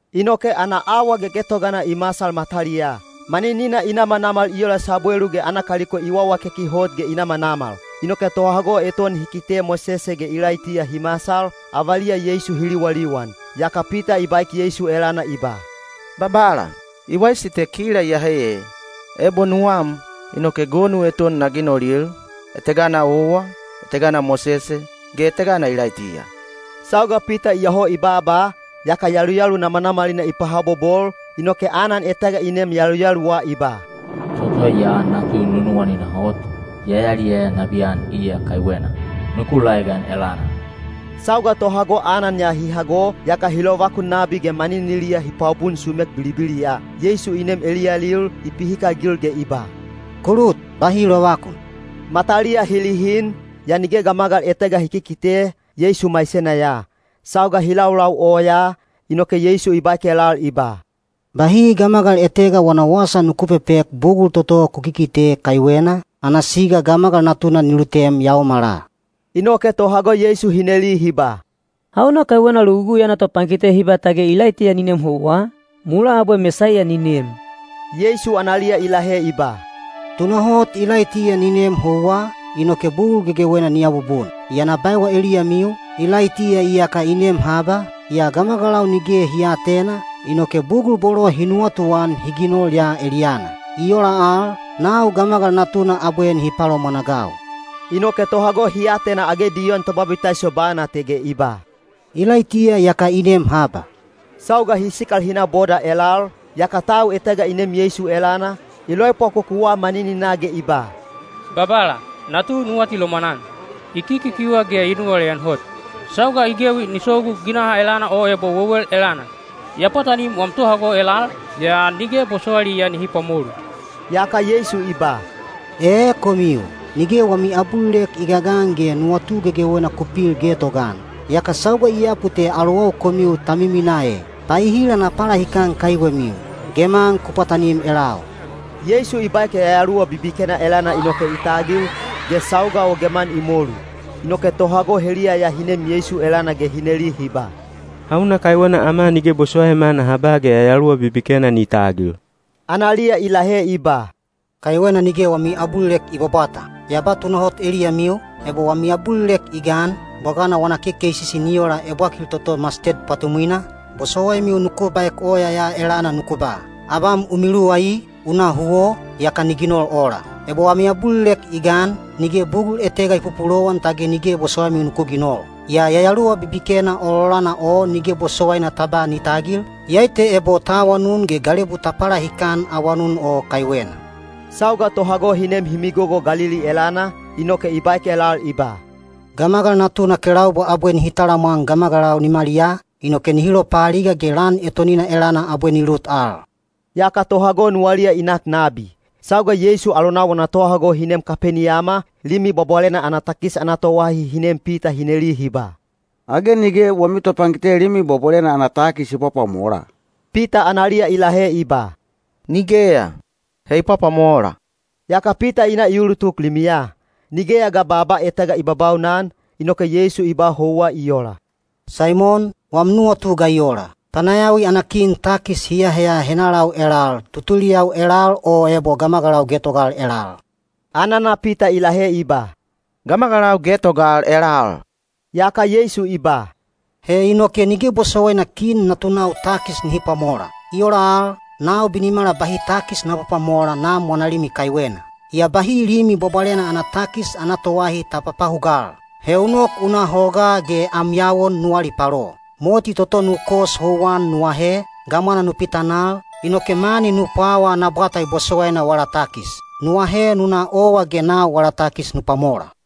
Inoke ana awa gegetogana i masal mataliyaa. Maninina i namanamal i ola sabwelu ge ana kaliko i wawakeki hot ge i namanamal. Inoke tohago eton hi kite Mosese ge Ilaitiya hi masal, avaliya Yeisu hi liwaliwan. Yaka Pita i baek Yeisu elana i ba, “Babala, i waisi te kila iyehe ee. Ebo nuwam, inoke gonu eton na ginolil, etegana owa, etegana Mosese, ge etegana Ilaitiya.” Sauga Pita iyoho i baaba, yaka yaluyalu namanamalina i pahabobol, inoke anan etega i neem yaluyaluwa i ba, “Toto ya natu nunuwanina hot; ya yaliyaya nabiyan iya kaiwena. Nuku laegan elana!” Sauga tohago anan ya hi hago, yaka hi lovakun nabi ge maniniliya hi pwabun sumek bilibiliya. Yeisu i nem eliyalil, i pihikagil ge i ba, “Ku lut. Bahi lovakun.” Mataliya hi lihin, yaa nige gamagal etega hi kikite, Yeisu maisena ya. Sauga hi laulau oyaa, inoke Yeisu i baek elal i ba, “Bahi gamagal etega wana wasa nuku pepek bugul toto ku kikite kaiwena, ana siga Gamagal Natuna ni lutem yaomala.” Inoke tohago Yeisu hi neli hi ba, “Hauna kaiwena Logugui ana topankite hi ba tage Ilaitiya ni nem houwa, mulaa abwe Mesaiya ni nem?” Yeisu analiya i lahe i ba, “Tunahot Ilaitiya ni nem houwa, inoke bugul gegewena ni abubun. Yaa na baewa eliyamiu, Ilaitiya iyaka i nem haba, yaa gamagalau nige hi aatena, inoke bugul bolo hi nuwatuan hi ginol ya eliyana. I ola al, nau Gamagal Natuna abwe nihi palomwanagau.” Inoke tohago hi atena age Diyon Tobabitaiso bana te ge i ba, “Ilaitiya iyaka i nem haba.” Sauga hi sikal hi na boda elal, yaka tau etega i nem Yeisu elana, i loepwakokuwa manininaa ge i ba, “Babala, natu nu atilomwan-an. I kikikiuha ge i nuwaleyan hot. Sauga i gewi ni sogu ginaha elana o ebo wewel elana. Ya pwatanim wam tohago elal, yaa nige bosowailiya nihi pwamolu.” Yaka Yeisu i ba, “Ee komiu, nige wami abulilek i gagan ge nuwatu gegewena ku pil getogaan! Yaka sauga i yapu te alowau komiu ta miminaa e! Paehila na palahikan kaiwemiu? Geman ku pwatanim elau.” Yeisu i baek yayaluwa bibikena elana inoke i tagil, ge sauga o geman i molu. Inoke tohago heliya ya hi nem Yeisu elana ge hi neli hi ba, “Hauna kaiwena ama nige bosowaima naha ba ge yayaluwa bibikena ni tagil?” Analiya i lahe i ba, “Kaiwena nige wami abulilek i bwabwata. Ya ba tunahot eliyamiu, ebo wami abulilek i gan, bwagana wana kekeisisi ni ola ebwakil toto masted pwatumwina, bosowaimiu nuku baek oya ya elana nuku ba, ‘Abam u miluwai, u na huwo,’ yaka ni ginol ola. Ebo wami abulilek i gan, nige bugul etega i pupulowan tage nige bosowaimiu nuku ginol. Yaa yayaluwa bibikena ololana o nige bosowaina ta ba ni tagil, iyai te ebo ta awanun ge galebu ta palahikan awanun o kaiwena.” Sauga tohago hi nem hi migogo Galili elana, inoke i baek elal i ba, “Gamagal Natuna kelaubwa abwe nihi talamwan gamagalau nimaliyaa, inoke nihi lopaaliga ge lan etonina elana abwe ni lut al.” Yaka tohago nuwaliya i nak nabi. Sauga Yeisu alonau wana tohago hi nem Kapeniyama, Limi Bwabwalena ana takis ana toahi hi nem Pita hi neli hi ba, “Age nige wami topankite Limi Bwabwalena ana takis i pwapwamola?” Pita analiya i lahe i ba, “Nigeya! He i pwapwamola.” Yaka Pita i na i ulutuk limiya. Nigeya ga baaba etega i babaunan, inoke Yeisu i ba houwa i ola, “Saimon, wam nuwatu ga i ola? Panayawi ana kin takis hi aaheya henalau elal—tutuliyau elal o ebo gamagalau getogal elal?” Anana Pita i lahe i ba, “Gamagalau getogal elal.” Yaka Yeisu i ba, “He inoke nige bosowaina kin natunau takis nihi pwamola. I ola al, nau binimala bahi takis na pwapwamola Nam wana limi kaiwena. Yaa bahi Limi Bwabwalena ana takis ana toahi ta papahugal. He u nok u na hogaa ge am yawon nu alipalo. Moti toto nu kos houwan nu ahe, gamwana nu pitanal, inoke mani nu pwawa ana bwata i bosowaina wala takis. Nu ahe nu na owa ge nau wala takis nu pwamola.”